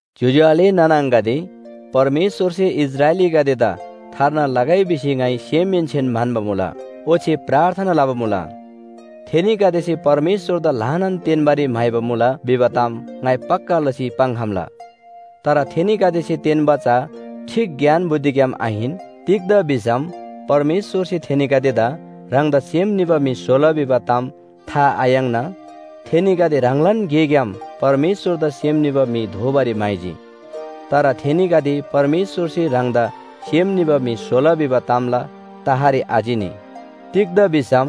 ज्‍योज्‍यो आले नाना आङागदे, परमेश्‍वरसे इस्राएलीगदेदा थार्ना लगै भिसी ङाइ सेमहेन्‍सेन म्‍हन्‍बा मुला, ओच्‍छे प्रार्थना लबा मुला। थेनीगदेसे परमेश्‍वरदा ल्‍हानान तेन्‍बारी म्‍हाइबा मुला भिबा ताम ङाइ पक्‍का लसी पाङ्‌खम्‍ला। तर थेनीगदेसे तेन्‍बा चा ठीक ज्ञान बुद्धिग्‍याम आहिन। तिग्‍दा भिसम परमेश्‍वरसे थेनीगदेदा ह्राङदा सेम निबा म्‍हि स्‍होला भिबा ताम था आयाङ्ना, थेनीगदे ह्राङलान गेग्‍याम परमेश्‍वरदा सेम निबा म्‍हि दोबारी म्‍हाइजी। तर थेनीगदे परमेश्‍वरसे ह्राङदा सेम निबा म्‍हि स्‍होला भिबा तामला तहरी आचिनी। तिग्‍दा भिसम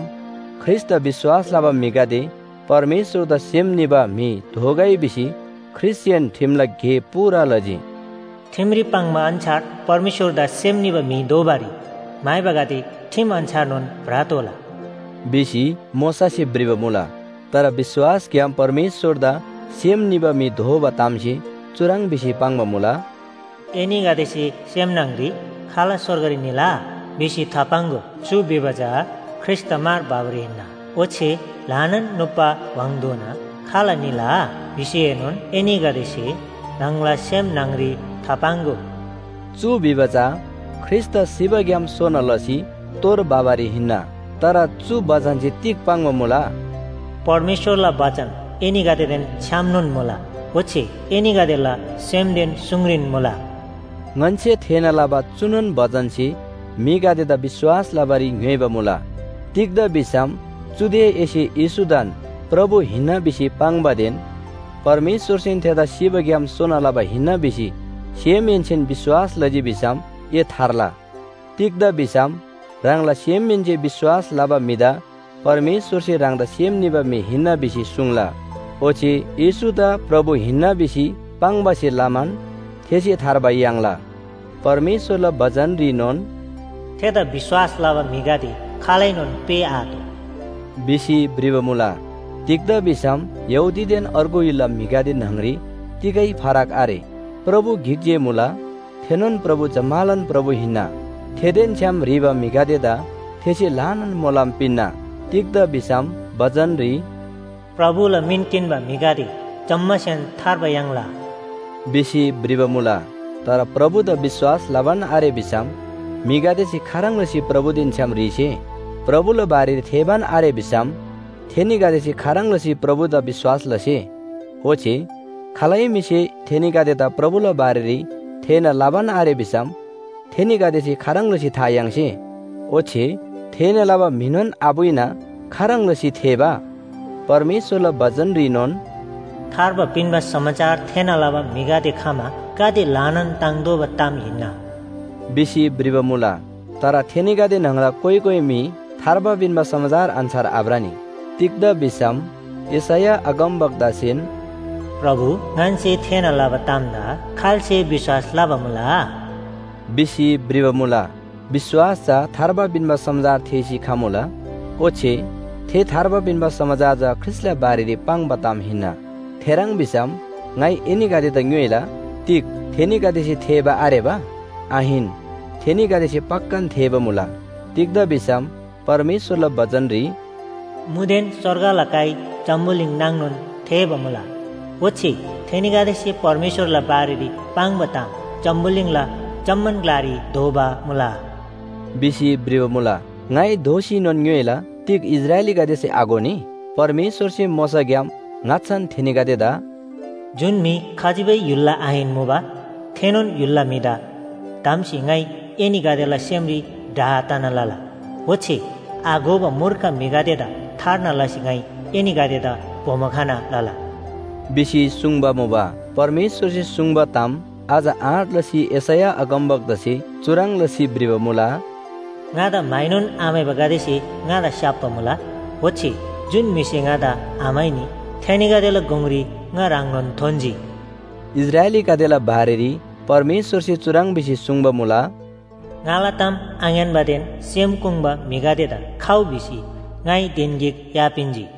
ख्रीष्‍टदा विश्‍वास लबा म्‍हिगदे परमेश्‍वरदा सेम निबा म्‍हि दोगै भिसी ख्रीष्‍टसेन ठिमला गे पूरा लजी। “ठिमरी पाङ्बा अन्‍छार परमेश्‍वरदा सेम निबा म्‍हि दोबारी म्‍हाइबागदे ठिम अन्‍छारनोन भ्रतोःला” भिसी मोशासे भ्रिबा मुला। तर विश्‍वासग्‍याम परमेश्‍वरदा सेम निबा म्‍हि दोबा तामसे चुह्रङ् भिसी पाङ्बा मुला, “एनीगदेसे सेम न्‍हङरी ‘खाल स्‍वर्गरी निला?’ भिसी थापाङ्‍गो, चु भिबा चा ख्रीष्‍टदा मार भबारी हिन्‍ना। ओच्‍छे ‘ल्‍हानान नुप्‍बा व्‍हाङधोना खाल निला?’ भिसीएनोन एनीगदेसे ह्राङला सेम न्‍हङरी थापाङ्‍गो।” चु भिबा चा ख्रीष्‍टदा सिबाग्‍याम सोना लसी तोर भबारी हिन्‍ना। तर चु बचनसे तिग पाङ्बा मुला? “परमेश्‍वरला बचन एनीगदेदेन छ्‌यामनोन मुला। ओच्‍छे एनीगदेला सेमदेन सुङरीन मुला।” ङन्‍से थेःना लबा चुनोन बचनसे म्‍हिगदेदा विश्‍वास लबारी ङ्‌योइबा मुला। तिग्‍दा भिसम चुदे एसे येशूदान प्रभु हिन्‍ना भिसी पाङ्‌बादेन परमेश्‍वरसेन थेदा सिबाग्‍याम सोना लबा हिन्‍ना भिसी सेमहेन्‍सेन विश्‍वास लजी भिसम ए थार्ला। तिग्‍दा भिसम ह्राङला सेमहेन्‍से विश्‍वास लबा म्‍हिदा परमेश्‍वरसे ह्राङदा सेम निबा म्‍हि हिन्‍ना भिसी सुङ्ला, ओच्‍छे येशूदा प्रभु हिन्‍ना भिसी पाङ्बासे लमान थेसे थार्बा याङ्ला। परमेश्‍वरला बचनरीनोन “थेदा विश्‍वास लबा म्‍हिगदे खालैनोन पेःआतोः” भिसी भ्रिबा मुला। तिग्‍दा भिसम यहूदीदेन अर्गु य्‍हुलला म्‍हिगदे न्‍हङरी तिगै फरक आरे। प्रभु गिक जे मुला, थेनोन प्रभु जम्‍मालान प्रभु हिन्‍ना। थेदेन छ्‌याम ह्रीबा म्‍हिगदेदा थेसे ल्‍हानान मोलम पिन्‍ना। तिग्‍दा भिसम बचनरी “प्रभुला मिन किन्‍बा म्‍हिगदे जम्‍मासेन थार्बा याङ्ला” भिसी भ्रिबा मुला। तर प्रभुदा विश्‍वास लबान आरे भिसम म्‍हिगदेसे खाह्रङ् लसी प्रभुदेन छ्‌याम ह्रीसे? प्रभुला बारेरी थेःबान आरे भिसम थेनीगदेसे खाह्रङ् लसी प्रभुदा विश्‍वास लसे? ओच्‍छे खालै म्‍हिसे थेनीगदेदा प्रभुला बारेरी थेःना लबान आरे भिसम थेनीगदेसे खाह्रङ् लसी था याङ्से? ओच्‍छे थेःना लबा म्‍हिनोन आपुइना खाह्रङ् लसी थेःबा? परमेश्‍वरला बचनरीनोन “थार्बा पिन्‍बा समाचार थेःना लबा म्‍हिगदे खमा गाते ल्‍हानान ताङ्तोःबा ताम हिन्‍ना” भिसी भ्रिबा मुला। तर थेनीगदे न्‍हङला कोइ कोइ म्‍हि थार्बा पिन्‍बा समाचार अन्‍छार आभ्रनी। तिग्‍दा भिसम यशैया अगमवक्तासेन “प्रभु, ङन्‍से थेःना लबा तामदा खाल्‍से विश्‍वास लबा मुला?” भिसी भ्रिबा मुला। विश्‍वास चा थार्बा पिन्‍बा समाचार थेःसी खमुला, ओच्‍छे थे थार्बा पिन्‍बा समाचार चा ख्रीष्‍टला बारेरी पाङ्बा ताम हिन्‍ना। थेह्रङ् भिसम ङाइ एनीगदेदा ङ्‌योइला, “तिग थेनीगदेसे थेःबा आरेबा?” आहिन, थेनीगदेसे पक्‍कान थेःबा मुला। तिग्‍दा भिसम परमेश्‍वरला बचनरी “मुदेन स्‍वर्गला काइ जम्‍बुलिङ नाङनोन थेःबा मुला, ओच्‍छे थेनीगदेसे परमेश्‍वरला बारेरी पाङ्बा ताम जम्‍बुलिङला जम्‍मान ग्‍लारी धोबा मुला” भिसी भ्रिबा मुला। ङाइ दोःसीनोन ङ्‌योइला, “तिग इस्राएलीगदेसे आघोनी?” परमेश्‍वरसे मोशाग्‍याम ङाच्‍छान थेनीगदेदा “जुन म्‍हि खजिबै य्‍हुलला आहिन मुबा, थेनोन य्‍हुलला म्‍हिदा धम्‍सी ङाइ एनीगदेला सेमरी डाह तना लला। ओच्‍छे आघोबा मूर्ख म्‍हिगदेदा थार्ना लसी ङाइ एनीगदेदा बोमो खना लला” भिसी सुङ्बा मुबा। परमेश्‍वरसे सुङ्बा ताम अझ आँट लसी यशैया अगमवक्तासे चुह्रङ् लसी भ्रिबा मुला, “ङादा म्‍हाइनोन आम्‍हाइबागदेसे ङादा स्‍याप्‍बा मुला, ओच्‍छे जुन म्‍हिसे ङादा आम्‍हाइनी थेनीगदेला गुङरी ङा ह्राङनोन थोन्‍जी” इस्राएलीगदेला बारेरी परमेश्‍वरसे चुह्रङ् भिसी सुङ्बा मुला, “ङाला ताम आङ्‌यान्‍बादेन सेम कोङ्बा म्‍हिगदेदा ‘खउ’ भिसी ङाइ धिन गिक या पिन्‍जी।”